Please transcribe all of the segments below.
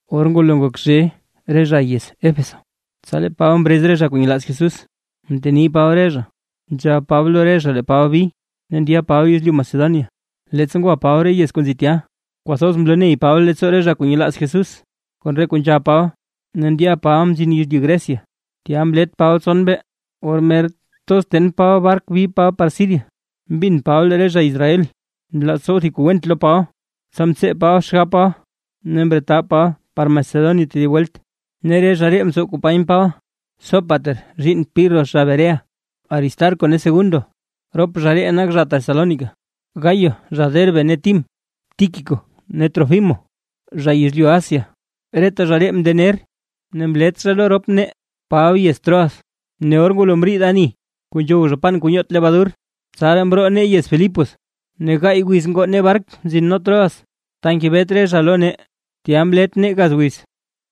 Or ngwalo ngok zhe re zha yez Éfeso, tsa lee Paba mrez re zha kuu nyelaaz Jesús, mteni Paba re zha, nzhab Paba lo re zha lee Paba bi, ne ndya Paba yezlyu Macedonia. Leettsa ngwa Paba re yez kuu nzi tya, kwathoz mloney Paba leettsoo re zha kuu nyelaaz Jesús kon re kuu nzhab Paba, ne ndya Paba mzin yezlyu Grecia, tya mlet Paba tson mbee. Or mer thoz ten Paba bark bi Paba par Siria, mbin Paba lee re zha Israel nlaaz tsow thib kuu went lo Paba. Tsa mtsee Paba xgab Paba ne mretab Paba par Macedonia tedib welt. Ne re zha ree mtsow company Paba; Sópater zhiinn Pirro zha Berea, Aristarco ne Segundo rop zha ree nak zha Tesalónica, Gayo zha Derbe ne Tim, Tíquico ne Trófimo zha yezlyu Asia. Reta zha ree mndener ne mlet zha lo rop nee Paba yez Troas. Ne or ngwalo mriid ani kuu nzhow zha pan kuu nyoot lebadur, tsaraa mroo nee yez Filipos, ne gaay wiz ngoo nee bark mzin nee Troas, ta ngebet re zha lo nee, tya mlet nee gaz wiz.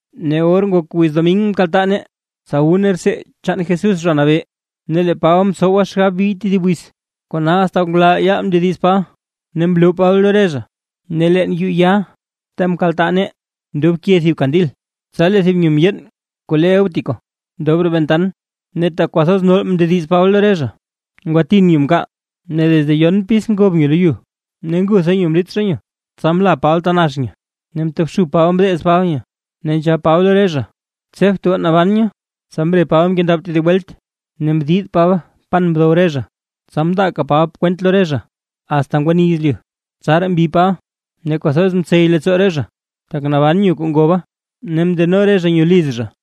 Ne or ngok wiz domin mkaltaa nee, tsa wu nee rtsee chaan Jesús Zha Nabee, ne lee Paba mtsowa xgab bi tedib wiz, kona asta ngulal yaal mndediz Paba ne mloo Paba lo re zha. Ne leen yuu ya ta mkaltaa nee ndobke thiban kandil, tsa lee thib nyo mndyeen kuu le Eutico ndob roo ventan. Ne tak kwathoz nol mndediz Paba lo re zha, ngwatin nyo mkaal ne desde yon pis ya ngob nyo lo yu, ne ngutha nyo mlit zha nyo. Tsa mla Paba ta nax nyo ne mtobxub Paba mdeez Paba nyo, ne nzhab Paba lo re zha: ―Tsebt goo, naban nyo. Tsa mre Paba mkendab tedib welt, ne mdid Paba pan mdow re zha, tsa mndaaka Paba kwent lo re zha, asta ngwani yezlyu; tsaraa mbi Paba. Ne kwathoz mtsey leettsoo re zha, tak naban nyo kuu ngoba, ne mndeno re zha nyo liz zha.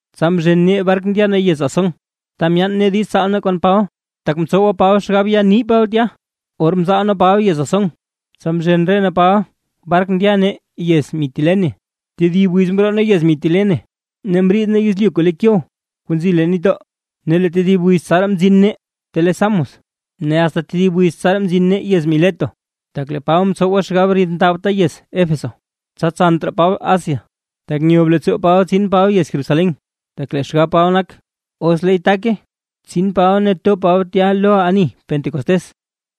Tsa mzhen nee bark ndya nee yez Asón, ta myaan nee diiz tsaal nee kon Paba, tak mtsowa Paba xgab ya ni Paba tya. Or mzaal nee Paba yez Asón, tsa mzhen re nee Paba bark ndya nee yez Mitilene. Tedib wiz mroo nee yez Mitilene mriid nee yezlyu kuu le Quío kuu nzi leen nitdoo, ne tedib wiz tsaraa mzin nee ta le Samos, ne asta tedib wiz tsaraa mzin nee yez Mileto. Tak lee Paba mtsowa xgab ridndabta yez Éfeso, tsa tsant raa Paba Asia; tak nyob leettsoo Paba tsin Paba yez Jerusalén, tak lee xgab Paba nak, os leey take, tsin Paba ne to Paba tya lo ani Pentecostés.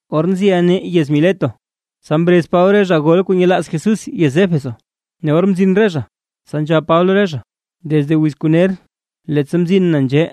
Or nziʼa nee yez Mileto, tsa mrez Paba re zha gol kuu nyelaaz Jesús yez Éfeso. Ne or mzin re zha, tsa nzhab Paba lo re zha: ―Desde wiz ner kuu leettsa mzin na nzhee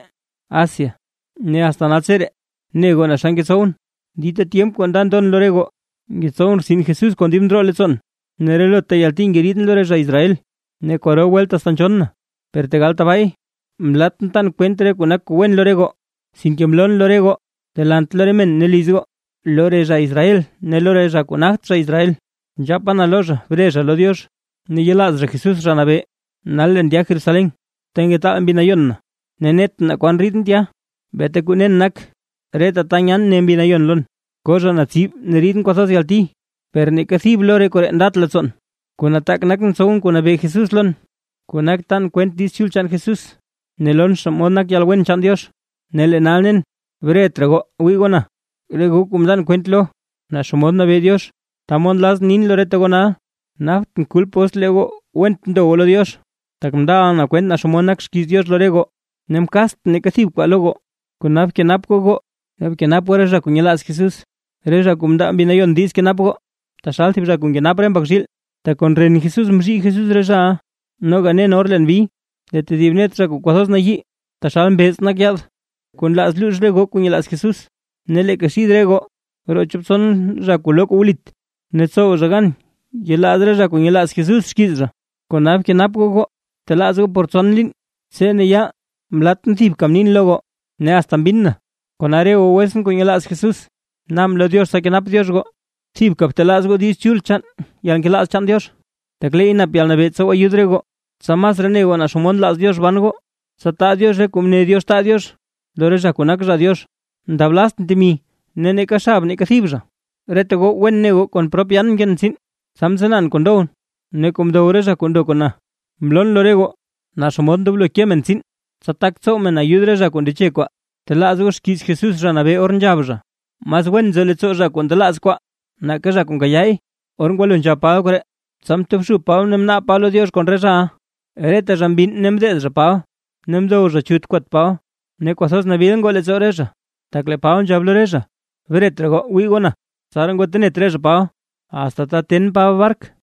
Asia, ne asta naltseree, ne goo naa xa ngetsowʼn, dita tyemp kuu nda ndon lo re goo, ngetsow rtsin Jesús kon dib ndroo leettsoon, ne relota yalti ngeriidʼn lo re zha Israel, ne kwaro welt asta nzhonn na. Per tegal tabaay, mlatʼn tan kwent re kuu nak kuu wen lo re goo, sinke mloon lo re goo delant lo re men ne liz goo. Lo re zha Israel ne lo re zha kuu nagt zha Israel, nzhapa na lo zha bre zha lo Diox ne yelaaz zha Jesús Zha Nabee. Nal leen ndya Jerusalén, ta ngetaal Mbi Nayon na ne netʼn naa kwan riidʼn tya. Beeta kuu nen nak, reta ta nyan ne Mbi Nayon lon, ko zha na tsib ne ridʼn kwathoz yalti. Per neeka thib lo re koree ndat leettsoon, kuu nataak nak tsowʼn kuu nabee Jesús lon, kuu nak tan kwent Diiz Chul chaan Jesús, ne lon xomod nak yalwen chaan Diox. ’Ne lee nal nen, bret raa goo wii goo na, re goo kuu mndan kwent lo naa xomod nabee Diox. Ta mod nlazʼn nin lo reta goo nal, naptʼn kulp os lee goo went ndo goo lo Diox. Tak mndaʼa na kwent naa xomod nak xkiiz Diox lo re goo, ne mkaatsʼn neeka thib kwaa lo goo. Kona kenap goo goo ne kenap goo re zha kuu nyelaaz Jesús, re zha kuu mndaa Mbi Nayon diiz kenap goo, taxal thib zha kuu nkenap re mbak zhiil, tak kon ren Jesús mzhii Jesús re zhaʼa. Noga nen or leen bi, lee tedib net re zha kuu kwathoz nayii taxal mbeez nak yaad, kuu nlaaz luux re goo kuu nyelaaz Jesús. Ne leeka xid re goo roo chop tson re zha kuu loo kuu wlit, ne tsow zha gan yelaaz re zha kuu nyelaaz Jesús xkiiz zha. Kona bkenap goo goo, btelaaz goo por tson liin tse ne yaal mlatʼn thibka mnin lo goo, ne asta mbinn na. ’Kona re goo wetsʼn kuu nyelaaz Jesús, naabʼn lo Diox tsa kenap Diox goo. Thibka btelaaz goo Diiz Chul chaan yalnkelaaz chaan Diox, tak leey nap yalnabee tsow ayud re goo, tsa masraa ne goo naa xomod nlaaz Diox ban goo, tsa taa Diox re kuu mne Diox taa Diox lo re zha kuu nak zha Diox. Mndablaztʼn temi ne neeka xab neeka thib zha, reta goo wen ne goo kon prop yaan mkeen tsiin, tsa mtsanaan kuu ndowʼn ne kuu ndow re zha kuu mndo kon na. Mloon lo re goo naa xomod ndoblo ke men tsiin, tsa tak tsow men ayud re zha kuu ndeche kwaa. Btelaaz goo xkiiz Jesús Zha Nabee or nzhab zha: “Mas wen nzo leettsoo zha kuu ndelaaz kwaa, nake zha kuu nkayaay”. Or ngwalo nzhab Paba koree, tsa mtobxub Paba ne mnaab Paba lo Diox kon re zhaʼa. Reta zha mbinn ne mdeez zha Paba ne mdow zha chut kwat Paba. Ne kwathoz nabil ngoo leettsoo re zha, tak lee Paba nzhab lo re zha: “Bret raa goo wii goo na”. Tsaraa ngwatenet re zha Paba, asta ta ten Paba bark.